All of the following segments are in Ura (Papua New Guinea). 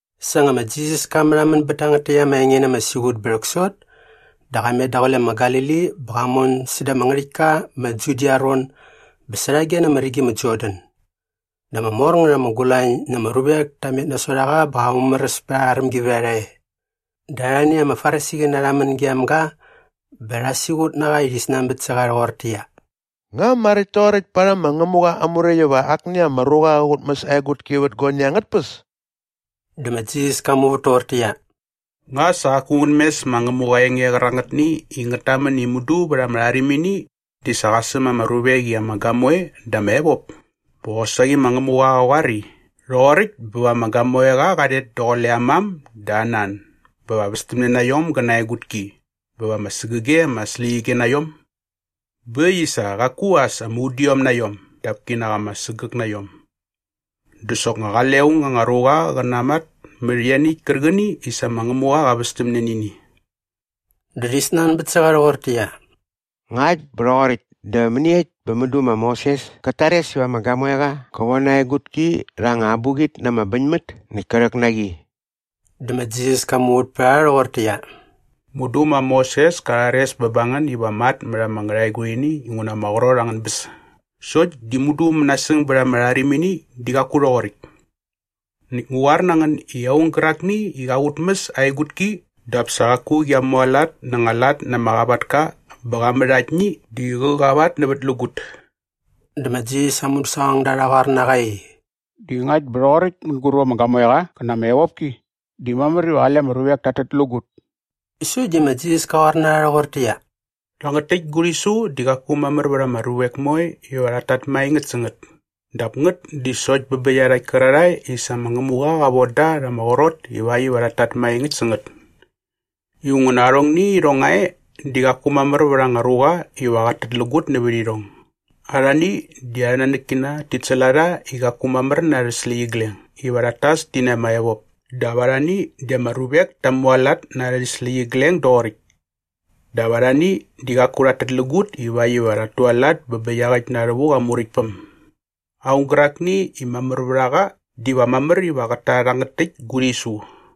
Sa nga ma Jisas ka märhamän bät tangät täkt ama enge na ama siqut bä rhäksot dä qa met daqule ma Galili bä qa mon säda ama ngärhäktka ma Judia aa ron bä särhage na ama rigi ma Jordan. Dä ama mor ngät ama gulañ na ama ruvek ta met nasot a qa bä qa mumäräs pät arha rämgivärharha e. Dä arhani ama Farisiqäna rha män gem ga bä rha siqut na qa i rhi snanbät sä qa rhoqortäqyia, “Nga maräkt toqoräkt parhäm ma Ngämuqa aa Muräkt iva akni ama ruqa qä qutmäs aa egutki vät guani angät tpäs?” Dä ma Jisas ka muvät toqortäqyia, “Nga sa qaku ngän mes ma Ngämuqa aa enge qärangätni i ngät tamän i mudu vät ama rharimini di sa qa säm ama ruvek i ama gamoe dä ama evop? Bä qosaqi ma Ngämuqa qa qoar i, ‘Rhoqoräkt bä va ama gamoeqa qa rhet daqule aa mam dä aa nan bä va västämne na iom gä na aa egutki bä va ama sägäge ama släqyige na iom’? Bä äkt i sa qaku as ama udiom na iom dap kinak ama sägäk na iom. Dä soknga qale aung anga ruqa qä namat mät ianiäkt kärqäni i sa ma Ngämuqa qa västämne nä ini.” Dä rhi snanbät sä qa rhoqortäqyia, “Ngakt bä rhoqoräkt dä mäniekt bä mudu ma Moses kät tares iva ama gamoeqa qä von aa egutki rha anga abuqit na ama bäñmät näkt kä rhäk na qi?” Dä ma Jisas ka muvät pät a rha rhoqortäqyia, “Mudu ma Moses ka rhares bä ba ngän iva matmät ama ngärhaegurhini inguna ama qrot angän bäs. Sokt di mudu mänasäng bät ama rharimini di qaku rhoqoräkt. Näkt ngu qoar na ngän i aung gärakni i qa qutmäs aa egutki dap sa qaku qia mualat na anga lat na ama qavatka bä qa mät aktni di qä qavatnävätlägut.” Dä ma Jisas aa mudäsaqongda rha qoar na qa i, “Di ngakt bä rhoqoräkt mänguräp ama gamoeqa qa na ama evopki di mamär iva qale ama ruvek tat tätlägut.” Sokt di ma Jisas ka qoar na rha rhoqortäqyia, “Rhangät täkt gu rhisu di qaku mamär vät ama ruvek moe iva rhat tat maengäkt sä ngät dap ngät di sokt bä bä iarhakt kärarhae i sa ma Ngämuqa qa von da rha ama qrot ivakt iva rhat tat maengäkt sä ngät. Inguna arhongni irhong nga e di qaku mamär vät anga ruqa iva qat tätlägut nävät irhong. Arhani di arhä nanäkkina tit säl a rha i qaku mamär na arhä släqyigleng iva rhat tas ti na ama evop dap arhani di ama ruvek ta mualat na arhä släqyigleng doqoräkt dap arhani di qaku rhat tätlägut ivakt iva rhat tualat bä bä iaqäkt na rhävuk aa Muräktpäm. Aung gärakni i mamär vät a qa diva mamär iva qät ta rhangät täkt gu rhisu.”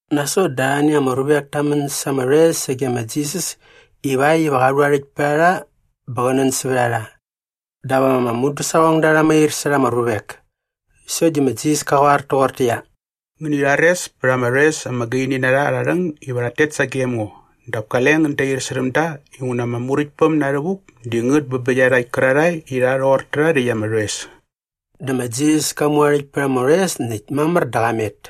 Nasot dä arhani ama ruvek ta män sa ama rhoes sage ma Jisas ivakt iva qa rhu aa rhäkt pät a rha bä qä nän sävät a rha. Dap ama mudäsaqongda rha mair särha ama ruvek. Sokt di ma Jisas ka qoar toqortäqyia, “Ngäni rhares pät ama rhoes ama gaini na rha arha rhäng iva rhat tet sagem ngo dap kale ngän dair särhäm da inguna ama Muräktpäm na rhävuk di ngät bä bä iarhakt kärarhae i rha rhoqor tärha rhäkt ama rhoes.” Dä ma Jisas ka mu aa rhäkt pät ama rhoes näkt mamär dä qa met.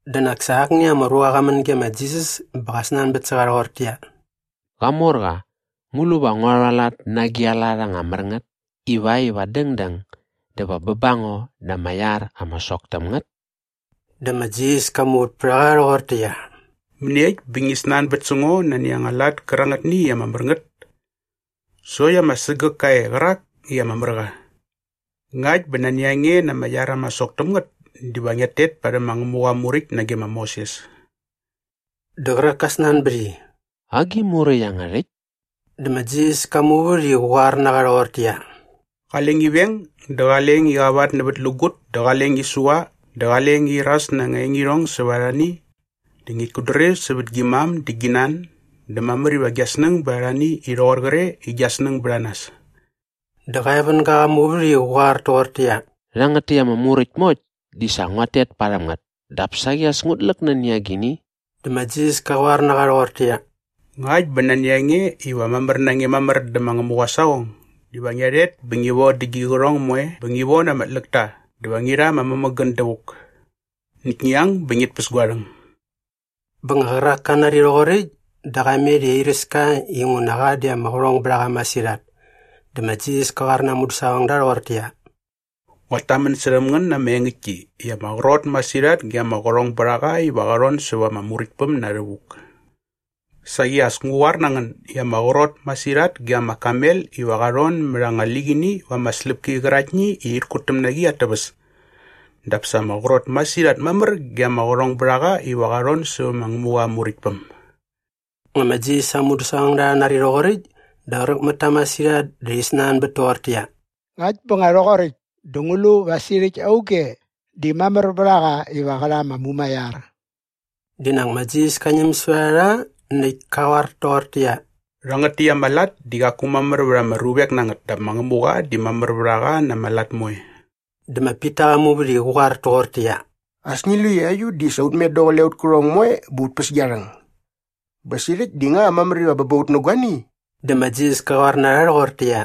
Dä nak sa akni ama ruqa qa män ge ma Jisas bä qa snanbät sä qa rhoqortäqyia, “Qamorqa, ngu lu va ngua rhualat na agi a lat anga mär ngät ivakt iva dängdäng dä va bä ba ngo na ama iar ama sok täm ngät?” Dä ma Jisas ka muvät pät a qa rhoqortäqyia, “Mäniekt bä ngi snanbät sä ngo nani anga lat kärangätni i ama mär ngät? Sokt ama sägäk ka e qärak i ama mär qa. Ngakt bä nani a nge na ama iar ama sok täm ngät diva ngiat tet parhäm ma Ngämuqa aa Muräkt nage ma Moses.” Dä qärak ka snanbät i, “Agi muräkt iangärhäkt?” Dä ma Jisas ka muvät i qä qoar na qa rhoqortäqyia, “Qale ngi veng dä qale ngi qavatnävätlägut dä qale ngi sua dä qale ngi iras na anga engirhong sävät arhani dä ngit kutdrir sävät gi mam dä gi nan dä mamär iva gia snäng bät arhani i rhoqor qre i gia snäng bät a nas.” Dä qa evänga qa muvät i qä qoar toqortäqyia, “Rhangät täkt ama muräkt moekt di sa nguat tet parhäm ngät dap saqi as ngut läk nani agini?” Dä ma Jisas ka qoar na qa rhoqortäqyia, “Ngakt bä nani a nge iva mamär na nge mamär dä ma Ngämuqa aa saqong diva ngia rhet bä ngi vodä gi qärhong moe bä ngi von ama tläkta dä va ngi rha ama mämägän dävuk. Näkt ngi ang bä ngit päs gua rhäng.” Bä nga qärak ka nari rhoqoräkt dä qa met i airäs ka inguna qa di ama qärhong bät a qa masirhat. Dä ma Jisas ka qoar na aa mudäsaqongda rhoqortäqyia, “Nguat tamän särhäm ngän na ama engäktki i ama qrot masirhat ge ama qärhongbärharha iva rha rhon säva ama Muräktpäm na rhävuk. Saqi as ngu qoar na ngän i ama qrot masirhat ge ama kamel iva qa rhon mät anga liqini va anga släpki qäraktni i rhit kutäm na qi at täväs dap sa ama qrot masirhat mamär ge ama qärhongbärhaqa iva qa rhon sävä ma Ngämuqa aa Muräktpäm.” Nga ma Jisas aa mudäsaqongda rha nari rhoqoräkt dä qräk mät ta masirhat dä rhi snanbät toqortäqyia, “Ngakt bä nga rhoqoräkt dä ngu lu va sirhäkt auge di mamär vät a qa iva qä rha ama mumaiar?” Di nak ma Jisas ka ñäm sävät a rha näkt ka qoar toqortäqyia, “Rhangät täkt ama lat di qaku mamär vät ama ruvek na ngät dap ma Ngämuqa di mamär vät a qa na ama lat moe.” Dä ma Pita qa muvät i qä qoar toqortäqyia, “As ngi lu i aiut di sa ut met daqule aut kärhong moe bä ut päs gia rhäng. Bä sirhäkt di nga mamär iva bä ba ut nä guani?” Dä ma Jisas ka qoar na rha rhoqortäqyia,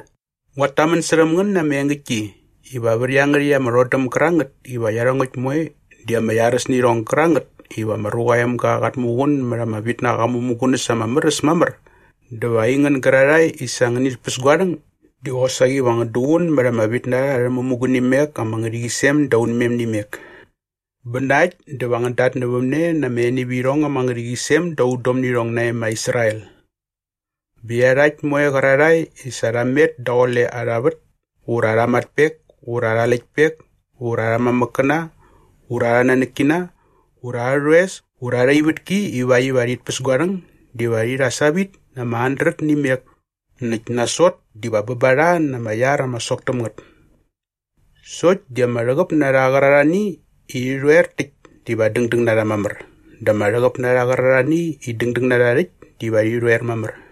“Nguat tamän särhäm ngän na ama engäktki iva vät iangärhäkt ama rhodäm gärangät iva iarhongäkt moe di ama iaräs nä irhong gärangät iva ma Ruqa aa Emga qat muqun mät aa vitnaqa aa mämugunäs ama mär äs mamär dä va aingän gärarhae i sa ngänit päs gua rhäng di qosaqi va ngän duqun mät ama vitnarha arhä mämugunimek ama ngärhäqyisem da unmem nä imek. Bä na äkt dä va ngän datnävämne na ama enivirhong ama ngärhäqyisem da udom nä irhong nae ma Israel. Bä iarhakt moe qärarhae i sa rha met daqule arha vät ura arha matpek ura arha läktpek ura arhä mamäkkäna ura arha nanäkkina ura arhä rhoes ura arha ivätki ivakt iva rhit päs gua rhäng diva rhi rha savit na ama handret nä imek näkt nasot diva bä ba rha na ama iar ama sok täm ngät. Sokt di ama rhäqäp na rha qärarhani i rhi rhoer täkt diva dängdäng na rha mamär dä ama rhäqäp na rha qärarhani i dängdäng na rha rhäkt diva rhi rhoer mamär.”